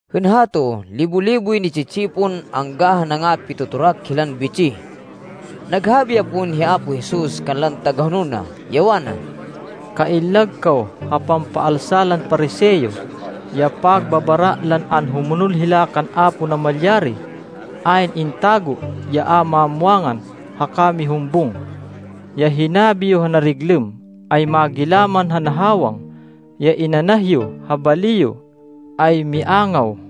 Hên hato, libo-liboy ni-tsi-tsipon angga ha nangapitotorak hilan bitsih. Naghabi ya pon hi Apo Jesus kanlan tagahonol na, ya wana, “Kaillag kaw ha pampaalsa lan Pariseo, ya pagbabara lan anhumonol hila kan Apo Namalyari. Ayn intago ya a mamwangan haka mihumbung. Ya hinabi yo ha nariglêm, ay magilaman ha nahawang. Ya inanah yo ha bali yo, ay miangaw.”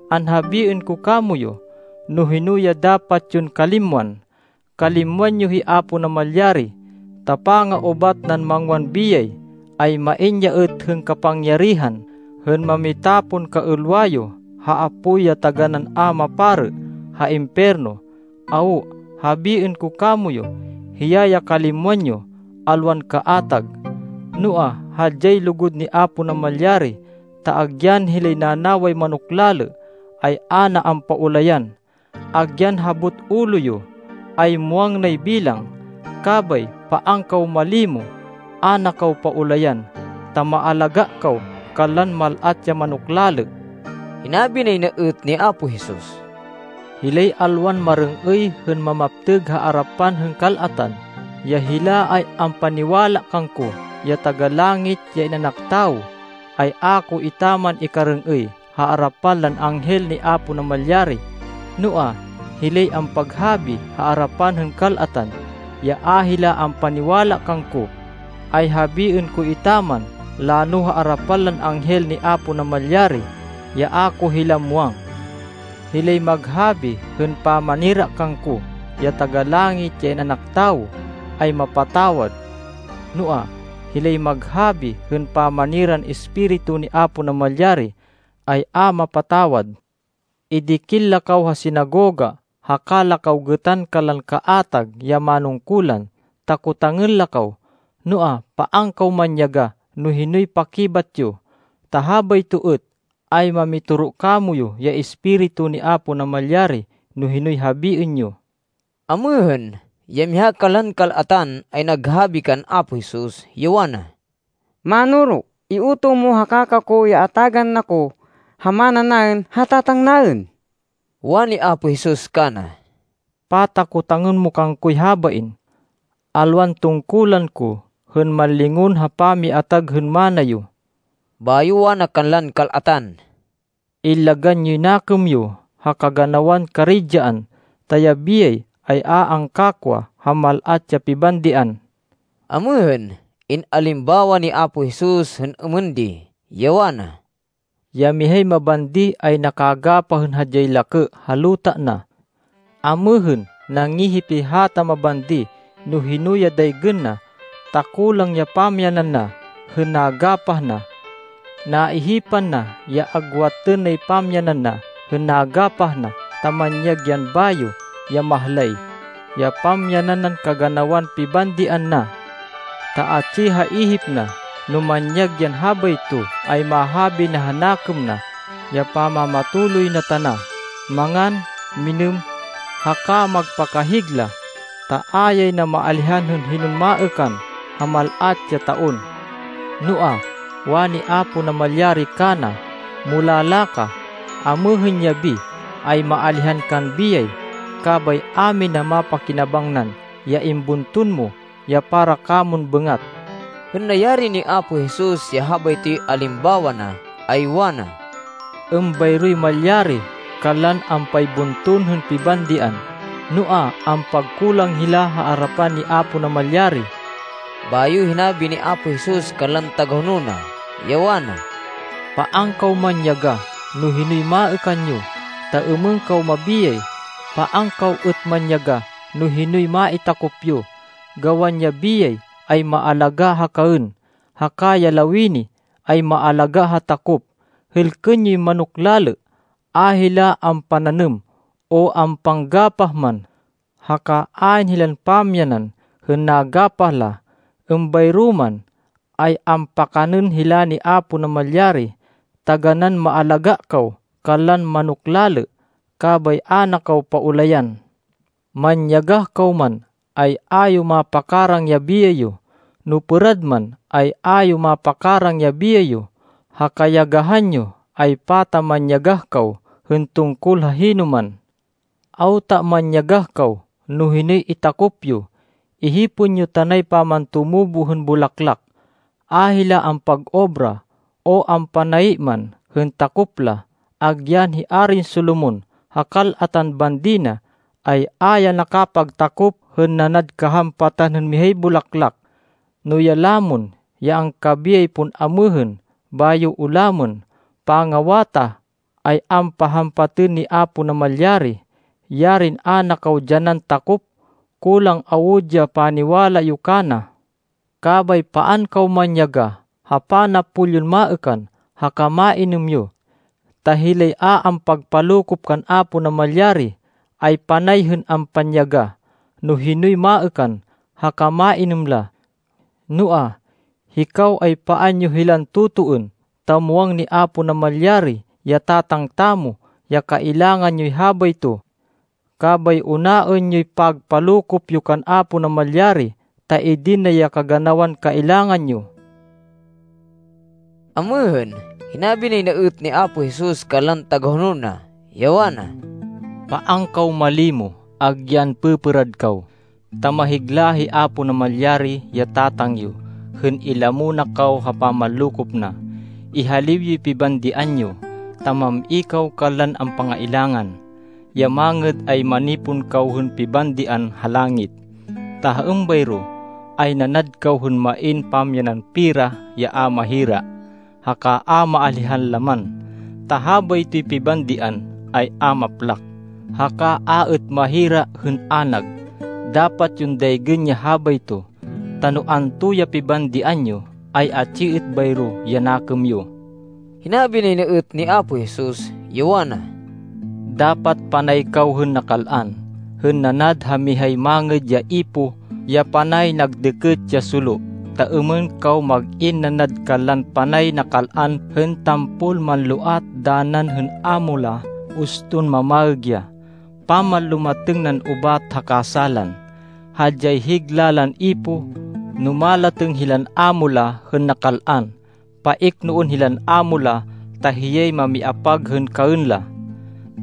Anhabiên ko kamoyu no hino ya dapat yon kalimwan. Kalimwan yo hi Apo Namalyari, ta panga-ubat nan mangwan biyay, ay main ya êt hên kapangyarihan hên mamitapon kaêlwa yo ha apoy ya taganán a maparê ha impiyerno. Awo. Habiên ko kamoyu, hiya ya kalimwan yo, alwan kaatag. “Noa, hadyay lugud ni Apo Namalyari, ta agyan hilay nanaway manok lalê, ay a na ampaulayan. Agyan habot ulo yo, ay muwang nay bilang. Kabay paan kaw malimo. A na kaw paulayan, ta maalagá kaw kanlan mal-at ya manok lalê.” Hinabi nay na êt ni Apo Jesus, “Hilay alwan marêng-êy hên mamaptêg ha arapan hên kal-atan ya hila ay ampaniwala kangko, ya Taga-Langit, ya In-anak Tawo, ay a ko etaman ikarêng-êy ha arapan lan anghel ni Apo Namalyari. Noa, hilay ampaghabi ha arapan hên kal-atan, ya a hila ampaniwala kangko, ay habiên ko etaman lano ha arapan lan anghel ni Apo Namalyari, ya a ko hila muwang. “Hilay maghabi hên pamanira kangko, ya Taga-Langit, ya In-anak Tawo, ay mapatawad. Noa, hilay maghabi hên pamaniran Espiritu ni Apo Namalyari, ay a mapatawad. “Idikil la kaw ha sinagoga haka la kaw gêtan kanlan kaatag ya manungkulan, ta kotangên la kaw, noa, paan kaw manyagah no hinoy pakibat yo, ta habayto êt ay mamitoro kamoyu ya Espiritu ni Apo Namalyari no hinoy habiên yo.” Amêhên, ya miha kanlan kal-atan, ay naghabi kan Apo Jesus, ya wana, “Mánoro, iutoh mo ha kaka ko ya atagan na ko ha mana naên ha tatang naên.” Wani Apo Jesus kana, “Pata kotangên mo kangkoy habain? Alwan tungkulan ko hên manlingon ha pamiatag hên mana yo.” Bayo wana kanlan kal-atan, “Illagan yoy nakêm yo ha kaganawan karidyaan, ta ya biyay ay a angkakwa ha mal-at ya pibandian.” Amêhên, in-alimbawa ni Apo Jesus hên êmên di, ya wana, “Ya mihay mabandi ay nakagapah hên hadyay lakê ha luta na. Amêhên, nangihip ya hata mabandi no hino ya daygên na, ta kulang ya pamyanan na hên nagapah na. Naihipan na ya agwatên nay pamyanan na hên nagapah na, ta manyag yan bayo, ya mahlay, ya pamyanan nan kaganawan pibandian na. Ta atsi ha ihip na, no manyag yan habayto, ay mahabi na ha nakêm na ya pamamatuloy na tana, mangan, minêm, haka magpakahigla, ta a yay na maalihan hên hinon maêkan ha mal-at ya taon. Noa, wani Apo Namalyari kana, ‘Mulala ka! Amêhên yabi, ay maalihan kan biyay. Kabay a mina mapakinabangnan ya imbunton mo ya para kamon bêngat.’” Hên nayari ni Apo Jesus ya habaytoy alimbawa na, ay wana, “Êmbayroy malyari kanlan ampaybunton hên pibandian, noa, ampagkulang hila ha arapan ni Apo Namalyari.” Bayo hinabi ni Apo Jesus kanlan tagahonol na, ya wana, “Paan kaw manyagah, no hinoy maêkan yo, ta êmên kaw mabiyay. Paan kaw êt manyagah no hinoy maitakop yo. Gawan ya biyay ay maalagá ha kaên, haka ya lawini ay maalagá ha takop. Hêlkên yoy manok lalê. A hila ampananêm o ampanggapah man, haka ayn hilan pamyanan hên nagapah la. Êmbayro man, ay ampakanên hila ni Apo Namalyari. Taganán maalagá kaw kanlan manok lalê, kabay a na kaw paulayan! Manyagah kaw man, ay a yo mapakarang ya biyay yo! No pêrad man, ay a yo mapakarang ya biyay yo ha kayagahan yo, ay pata manyagah kaw hên tungkol ha hinoman! Awta manyagah kaw no hinoy itakop yo! Ihipên yo tanay pamantumubo hên bulaklak. A hila ampag-obra o ampanayi man hên takop la. Agyan hi Arin Solomon, ha kal-atan bandi na, ay a ya nakapagtakop hên nanad kahampatan hên mihay bulaklak. No ya lamon, ya angkabiyay pon amêhên, bayo ulamên pangawatah, ay ampahampatên ni Apo Namalyari, yarin a na kaw dyanan takop! Kulang awud ya paniwala yo kana. Kabay paan kaw manyagah ha panapol yon maêkan haka mainêm yo. Ta hilay a ampagpalokop kan Apo Namalyari, ay panay hên ampanyagah no hinoy maêkan haka mainêm la. Noa, hikaw ay paan yo hilan totoên, ta muwang ni Apo Namalyari ya Tatang tamo ya kailangan yoy habayto. Kabay unaên yoy pagpalokop yo kan Apo Namalyari, ta idin na ya kaganawan kailangan yo.” Amêhên, hinabi nay na êt ni Apo Jesus kanlan tagahonol na, ya wana, “Paan kaw malimo agyan pêpêrad kaw, ta mahigla hi Apo Namalyari, ya Tatang yo hên ilamo na kaw ha pamanlokop na. Ihaliw yoy pibandian yo, ta mam-i kaw kanlan ampangailangan. Ya mangêd ay manipon kaw hên pibandian ha langit, ta ha êmbayro, ay nanad kaw hên main pamyanan pera ya a mahira, haka a maalihan laman. Ta habaytoy pibandian ay a maplak, haka a êt mahira hên anag. Dapat yon daygên ya habayto, ta no anto ya pibandian yo, ay atsi êt bayro ya nakêm yo.” Hinabi nay na êt ni Apo Jesus, ya wana, “Dapat panay kaw hên nakal-an, hên nanad ha mihay mangêd ya ipoh ya panay nag dêkêt ya solo, ta êmên kaw mag-in nanad kanlan panay nakal-an hên tampol manloat danan hên amo la uston mamaêg ya, pamanlumatêng nan ubat ha kasálan. Hadyay higla lan ipoh, no malatêng hilan amo la hên nakal-an. Paiknoên hilan amo la, ta hiyay mamiapag kaên la.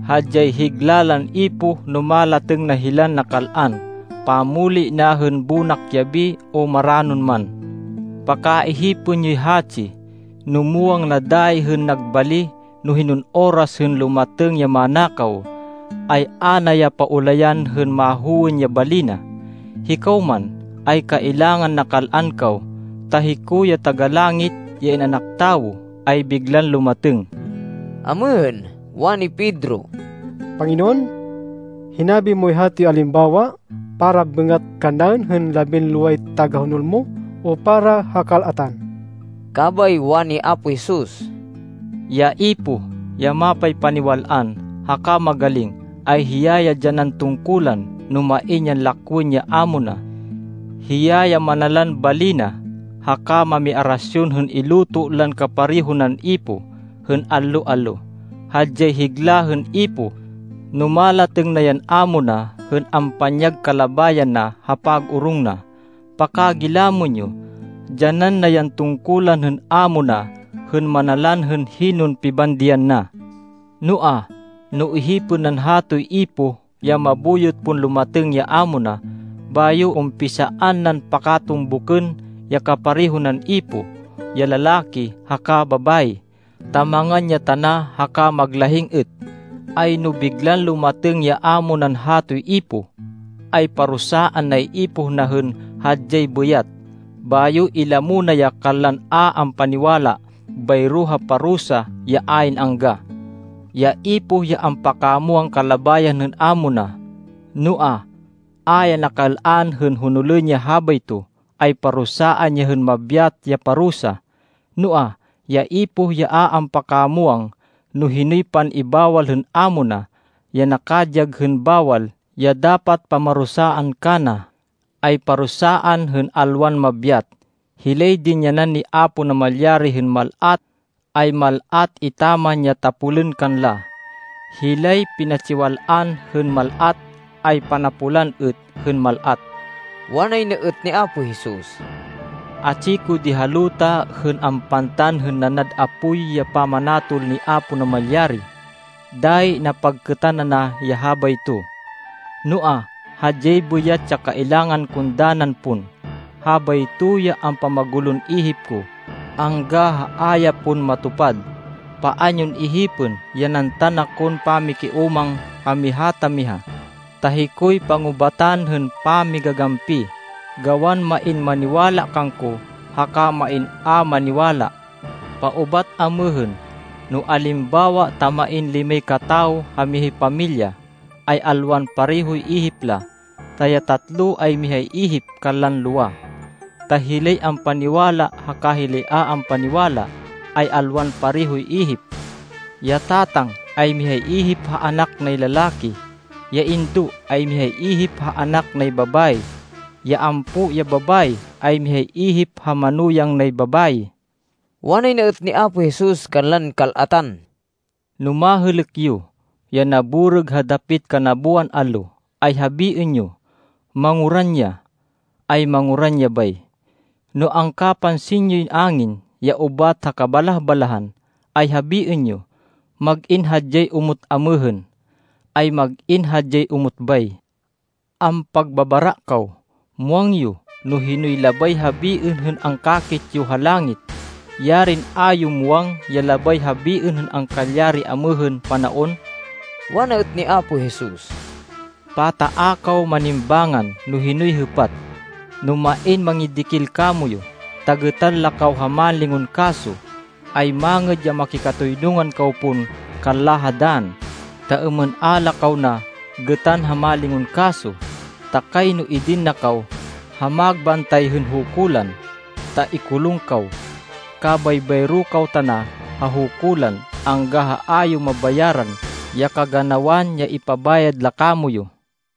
Hadyay higla lan ipoh no malatêng na hilan nakal-an, pammuli na hên bonak yabi o maranon man. Pakaihipên yoy hatsi, no muwang na dayi hên nag bali no hinon oras hên lumatêng ya manakaw, ay a na ya paulayan hên mahowên ya bali na. Hikaw man, ay kailangan nakal-an kaw, ta hiko ya Taga-Langit, ya In-anak Tawo, ay biglan lumatêng.” Amêhên, wani Pedro, “Panginoon, hinabi moy hatoy alimbawa para bêngat kannaên hên labinloway tagahonol mo o para ha kal-atan?” Kabay wani Apo Jesus, “Ya ipoh ya mapaypaniwal-an haka magaling, ay hiya ya dyanan tungkulan no main yan lakwên ya amo na. Hiya ya manalan bali na, haka mamiarasyon hên iluto lan kapareho nan ipoh, hên allo-allo. Hadyay higla hên ipoh, no malatêng na yan amo na hên ampanyag kalabayan na ha pag-orong na. Pakagilamên yo, dyanan na yan tungkulan hên amo na hên manalan hên hinon pibandian na. Noa, no ihipên nan hatoy ipoh ya mabuyot pon lumatêng ya amo na, bayo umpisaan nan pakatumbukên ya kapareho nan ipoh, ya lalaki haka babayi, ta mangan ya tana haka maglahing êt, ay no biglan lumatêng ya amo nan hatoy ipoh, ay parusaan nay ipoh na hên hadyay bêyat, bayo ilamo na ya kanlan a ampaniwala, bayro ha parusa ya ayn angga. “Ya ipoh ya ampakamwang kalabayan hên amo na, noa, a ya nakal-an hên honolên ya habayto, ay parusaan ya hên mabyat ya parusa. Noa, ya ipoh ya a ampakamwang no hinoy pan-ibawal hên amo na, ya nakadyag hên bawal ya dapat pamarusaan kana, ay parusaan hên alwan mabyat. Hilay dinyanan ni Apo Namalyari hên mal-at, ay mal-at etaman ya tapolên kanla. Hilay pinatsiwal-an hên mal-at, ay panapolan êt hên mal-at.” Wanay na êt ni Apo Jesus, “Atsi ko di ha luta hên ampantan hên nanad apoy ya pamanatol ni Apo Namalyari. Dayi napagkêtan ana ya habayto. Noa, hadyay bêyat ya kailangan kon danan pon. Habayto ya ampamagulon ihip ko angga ha a ya pon matupad. Paan yon ihipên ya nantan akon pamikiúmang ha miha ta miha, ta hikoy pangubatan hên pamigagampi, gawan main maniwala kangko, haka main a maniwala. Paubat amêhên, no alimbawa ta main limay katawo ha mihay pamilya, ay alwan parehoy ihip la, ta ya tatlo ay mihay ihip kanlan lowa. Ta hilay ampaniwala haka hilay a ampaniwala, ay alwan parehoy ihip. Ya tatang ay mihay ihip ha anak nay lalaki. Ya indo ay mihay ihip ha anak nay babayi. Ya ampo ya babayi ay mihay ihip ha manuyang nay babayi.” Wanay na êt ni Apo Jesus kanlan kal-atan, “No mahêlêk yo ya naborêg ha dapit kanaboan allo, ay habiên yo, ‘Manguran ya.’ Ay manguran ya bay. No angkapansin yoy angin ya ubat ha kabalah-balahan, ay habiên yo, ‘Mag-in hadyay omot amêhên.’ Ay mag-in hadyay omot bay. Ampagbabara kaw! Muwang yo no hinoy labay habiên hên angkakit yo ha langit. Yarin a yo muwang ya labay habiên hên angkalyari amêhên panaon!” Wana êt ni Apo Jesus, “Pata a kaw manimbángan no hinoy hêpat? No main mamidikil kamoyu, ta gêtan la kaw ha mánlingon kaso, ay mangêd ya makikatoynungan kaw pon kanla ha dann, ta êmên a la kaw na gêtan ha mánlingon kaso. Ta kayno idin na kaw ha magbantay hên hukulan, ta ikulung kaw. Kabay bayro kaw tana ha hukulan angga ha a yo mabayaran ya kaganawan ya ipabayad la kamoyu.”